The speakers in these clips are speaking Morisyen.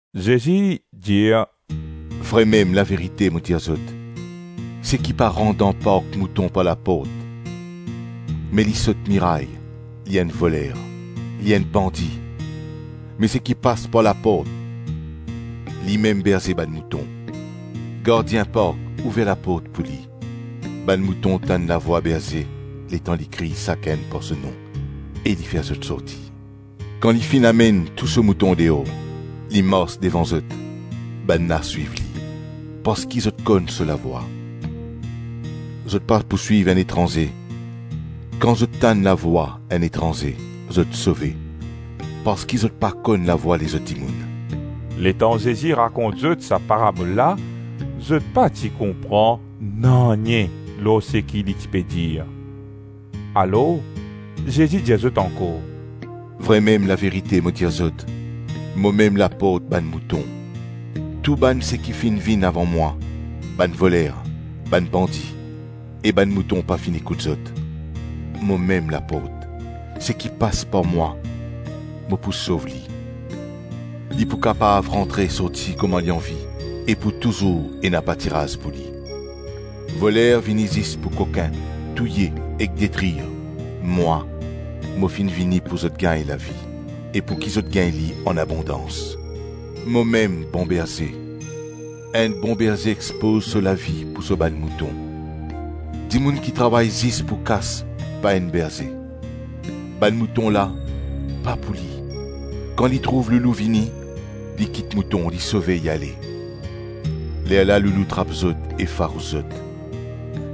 Zezi dir, “Vremem laverite mo dir zot, seki pa rant dan park mouton par laport me li sot miray, li enn voler, li enn bandi. Me seki pas par laport, limem berze bann mouton. Gardien park ouver laport pou li: bann mouton tann lavwa berze letan li kriy sakenn par so nom e li fer zot sorti. Kan li finn amenn tou so mouton deor, li mars devan zot, bannla swiv li, parski zot konn so lavwa. Zot pa pou swiv enn etranze; kan zot tann lavwa enn etranze zot sove parski zot pa konn lavwa lezot dimoun.” Letan Zezi rakont zot sa parabol la, zot pa ti konpran nanye lor seki li ti pe dir. Alors Zezi dir zot ankor, “Vremem laverite mo dir zot, momem laport bann mouton. Tou bann seki finn vinn avan mwa, bann voler, bann bandi e bann mouton pa finn ekout zot. Momem laport; seki pas par mwa, mo pou sov li, li pou kapav rantre sorti kouma li anvi e pou touzour ena patiraz pou li. Voler vini zis pou kokin, touye ek detrir; mwa, mo finn vini pou zot gagn lavi, e pouki zot gagn li anabondans. Momem bon berze; enn bon berze expoz so lavi pou so bann mouton. Dimoun ki travay zis pou kas pa enn berze; bann mouton la pa pou li. Kan li trouv loulou vini, li kit mouton, li sove, li ale. Lerla loulou trap zot e farous zot.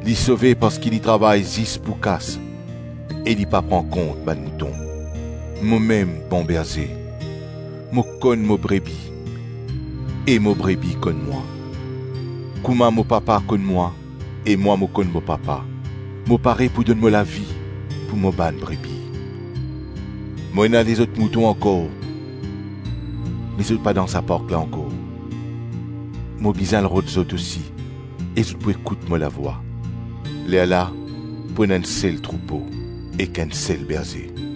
Li sove parski li travay zis pou kas e li pa pran kont bann mouton. Momem bon berze, mo konn mo brebi e mo brebi konn mwa. Kouma mo papa konn mwa, e mwa mo konn mo papa, mo pare pou donn mo lavi pou mo bann brebi. Mo ena lezot mouton ankor me zot pa dan sa park la ankor; mo bizin al rod zot osi e zot pou ekout mo lavwa. Lerla pou ena enn sel troupo ek enn sel berze.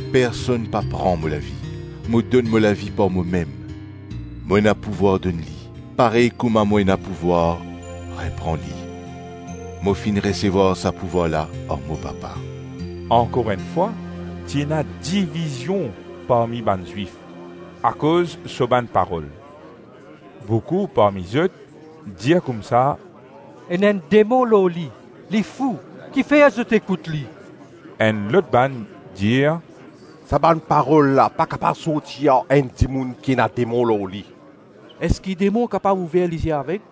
Personn pa pran mo lavi; mo donn mo lavi par momem; mo ena pouvwar donn li, parey kouma mo ena pouvwar repran li. Mo finn resevwar sa pouvwar la ar mo papa.” Ankor enn fwa, ti ena divizion parmi bann Zwif, akoz so bann parol. Boukou parmi zot dir koumsa, “Ena enn demon lor li, li fou, ki fer zot ekout li?” Enn lot bann dir, “Sa bann parol la pa kapav sorti ar enn dimoun ki ena demon lor li; eski demon kapav ouver lizie aveg?”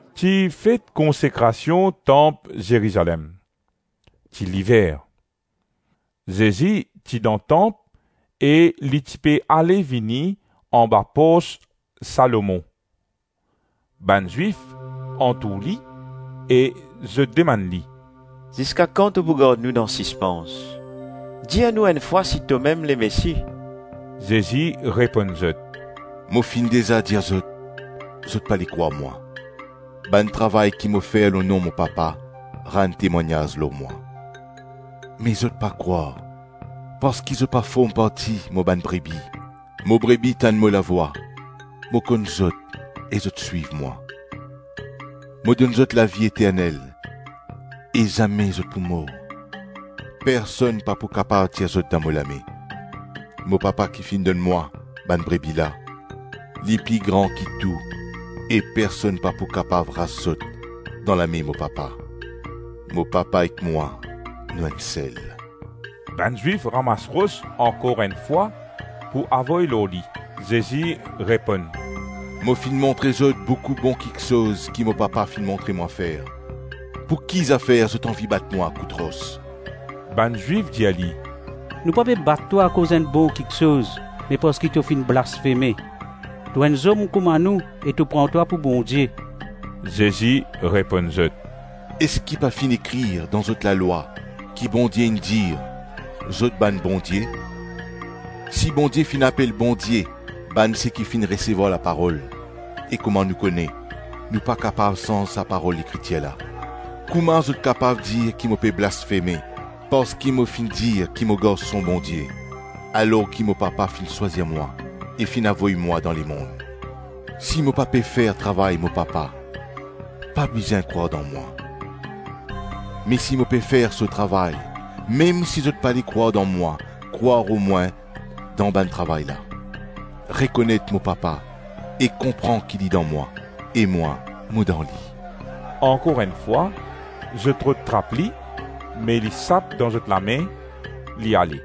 Ti fet Konsekrasion Tanp Zerizalem. Ti liver. Zezi ti dan tanp e li ti pe ale-vini anba pors Salomon. Bann Zwif antour li e zot demann li, “Ziska kan to pou gard nou dan sispans? Dir nou enn fwa si tomem Lemesi?” Zezi reponn zot, “Mo finn deza dir zot, zot pale krwar mwa; bann travay ki mo fer lor nom mo Papa rann temwagnaz lor mwa, me zot pa krwar parski zot pa form parti mo bann brebi. Mo brebi tann mo lavwa, mo konn zot e zot swiv mwa. Mo donn zot lavi eternel, e zame zot pou mor. Personn pa pou kapav tir zot dan mo lame. Mo Papa ki finn donn mwa bann brebi la, li pli gran ki tou e personn pa pou kapav ras zot dan lame mo Papa. Mo Papa ek mwa nou enn sel.” Bann Zwif ramas ros ankor enn fwa pou avoy lor li. Zezi reponn, “Mo finn montre zot boukou bon kiksoz ki mo Papa finn montre mwa fer, pouki zafer zot anvi bat mwa kout ros?” Bann Zwif dir li, “Nou pa pe bat twa akoz enn bon kiksoz me parski to finn blasfeme: to enn zom kouma nou e to pran twa pou Bondie.” Zezi reponn zot, “Eski pa finn ekrir dan zot lalwa ki Bondie inn dir, ‘Zot bann bondie?’ Si Bondie finn apel bondie bann seki finn resevwar laparol (e kouma nou kone, nou pa kapav sanz sa parol Lekritir la), kouma zot kapav dir ki mo pe blasfeme parski mo finn dir ki mo Garson Bondie, alors ki mo papa finn swazir mwa e finn avoy mwa dan lemonn? Si mo pa pe fer travay mo Papa, pa bizin krwar dan mwa, me si mo pe fer so travay, mem si zot pale krwar dan mwa, krwar omwin dan bann travay la. Rekonet mo Papa e konpran ki li dan mwa, e mwa, mo dan li.” Ankor enn fwa, zot rod trap li me li sap dan zot lame, li ale.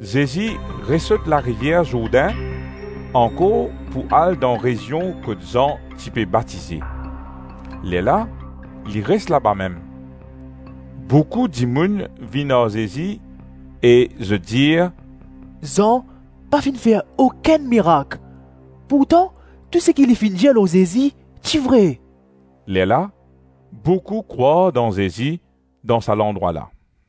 Zezi resot larivier Zourdin ankor pou al dan rezion kot Zan ti pe batize. Lerla li res laba mem. Boukou dimoun vinn ar Zezi e zot dir, “Zan pa finn fer okenn mirak pourtan tou seki li finn dir lor Zezi ti vre.” Lerla boukou krwar dan Zezi dan sa landrwa la.